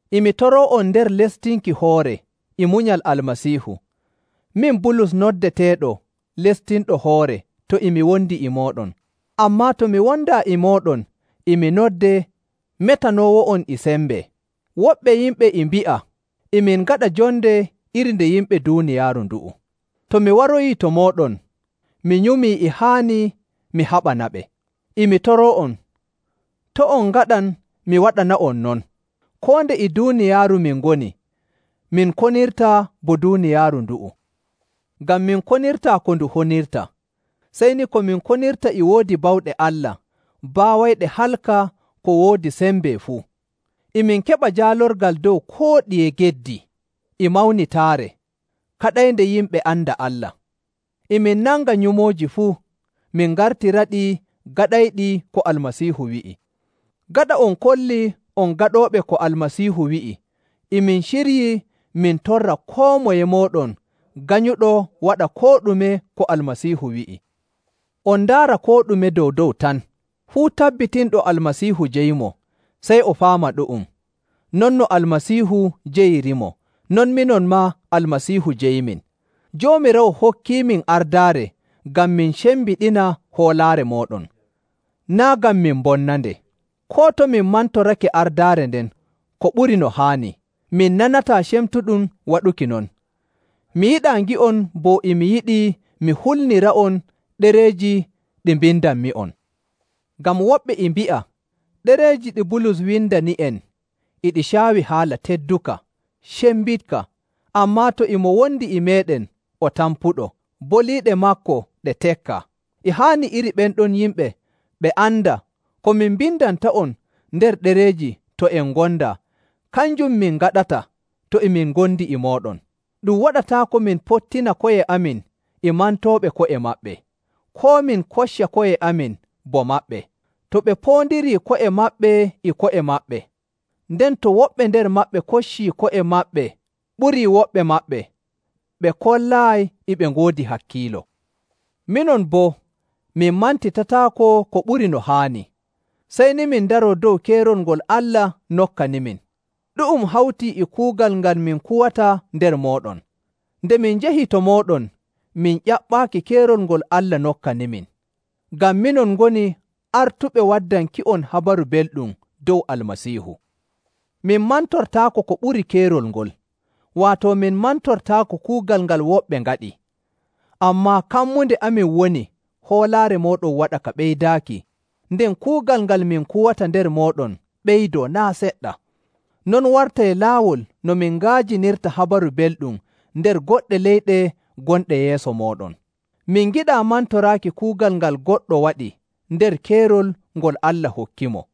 E mi toroo'on nder lestinki hoore e munyal Almasiihu, min Bulus noddeteeɗo “lestinɗo hoore” to e mi wondi e mooɗon, ammaa to mi wondaa e mooɗon e mi noddee “metanoowo'on e sembe.” Woɓɓe yimɓe e mbi'a e min ngaɗa jonde iri nde yimɓe duuniyaaru ndu'u. To mi waroyii to mooɗon, mi nyumii e haani mi haɓanaɓe. E mi toroo'on, to' on ngaɗan mi waɗana'on non. Koo nde e duuniyaaru min ngoni, min konirtaa bo duuniyaaru ndu'u, ngam min konirtaa ko ndu honirta. Sey ni ko min konirta e woodi bawɗe Allah baawayɗe kalka ko woodi sembe fuu. E min keɓa jaalorgal dow koo ɗiye geddi e mawnitaare kaɗaynde yimɓe anda Allah. E min nanga nyumooji fuu, min ngartiraɗi gaɗayɗi ko Almasiihu wi'i. Gaɗa on kollii on gaɗooɓe ko Almasiihu wi'i, e min ciryii min torra koo moye mooɗon ganyuɗo waɗa koo ɗume ko Almasiihu wi'i. On ndaara koo ɗume dow‑dow tan. Fuu tabbitinɗo Almasiihu jeyimo, sey o faama ɗu'um, non no Almasiihu jeyirimo, non minon maa Almasiihu jeyimin. Joomiraawo hokkiimin ardaare ngam min cembiɗina hoolaare mooɗon, naa' ngam min mbonnande. Koo to min mantorake ardaare nden ko ɓuri no haani, min nanataa cemtuɗum waɗuki non. Mi yiɗaa ngi'on bo e mi yiɗi mi hulnira'on ɗereeji ɗi mbindanmi'on. Ngam woɓɓe e mbi'a, “Ɗereeji ɗi Bulus windani'en e ɗi caawi haala tedduka, cembiɗka, ammaa to e mo wondi e meeɗen o tampuɗo, boliiɗe maako ɗe tekkaa.” E haani iri ɓen ɗon yimɓe ɓe anda ko min mbindanta'on nder ɗereeji to en ngondaa, kanjum min ngaɗata to e min ngondi e mooɗon. Ɗum waɗataako min pottina ko'e amin e mantooɓe ko'e maɓɓe, koo min kocca ko'e amin bo maɓɓe. To ɓe poondirii ko'e maɓɓe e ko'e maɓɓe, nden to woɓɓe nder maɓɓe koccii ko'e maɓɓe ɓurii woɓɓe maɓɓe, ɓe kollaayi e ɓe ngoodi hakkiilo. Minon boo, min mantitataako ko ɓuri no haani, sey ni min ndaroo dow keerol ngol Allah nokkanimin. Ɗu'um hawtii e kuugal ngal min kuwata nder mooɗon. Nde min njahi to mooɗon, min ƴaɓɓaaki keerol ngol Allah nokkanimin, ngam minon ngoni artuɓe waddanki'on Habaru Belɗum dow Almasiihu. Min mantortaako ko ɓuri keerol ngol, waato min mantortaako kuugal ngal woɓɓe ngaɗi. Ammaa kammunde amin woni hoolaare mooɗon waɗa ka ɓeydaaki, nden kuugal ngal min kuwata nder mooɗon ɓeydoo naa' seɗɗa. Non wartay laawol no min nga'ajinirta Habaru Belɗum nder goɗɗe leyɗe gonɗe yeeso mooɗon. Min ngiɗaa mantoraaki kuugal ngal goɗɗo waɗi nder keerol ngol Allah hokkimo.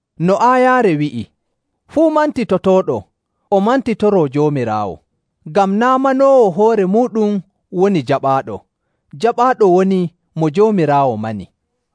No aayaare wi'i, “Fuu mantitotooɗo, o mantitoroo Joomiraawo.” Ngam naa' manoowo hoore muuɗum woni jaɓaaɗo; jaɓaaɗo woni mo Joomiraawo mani.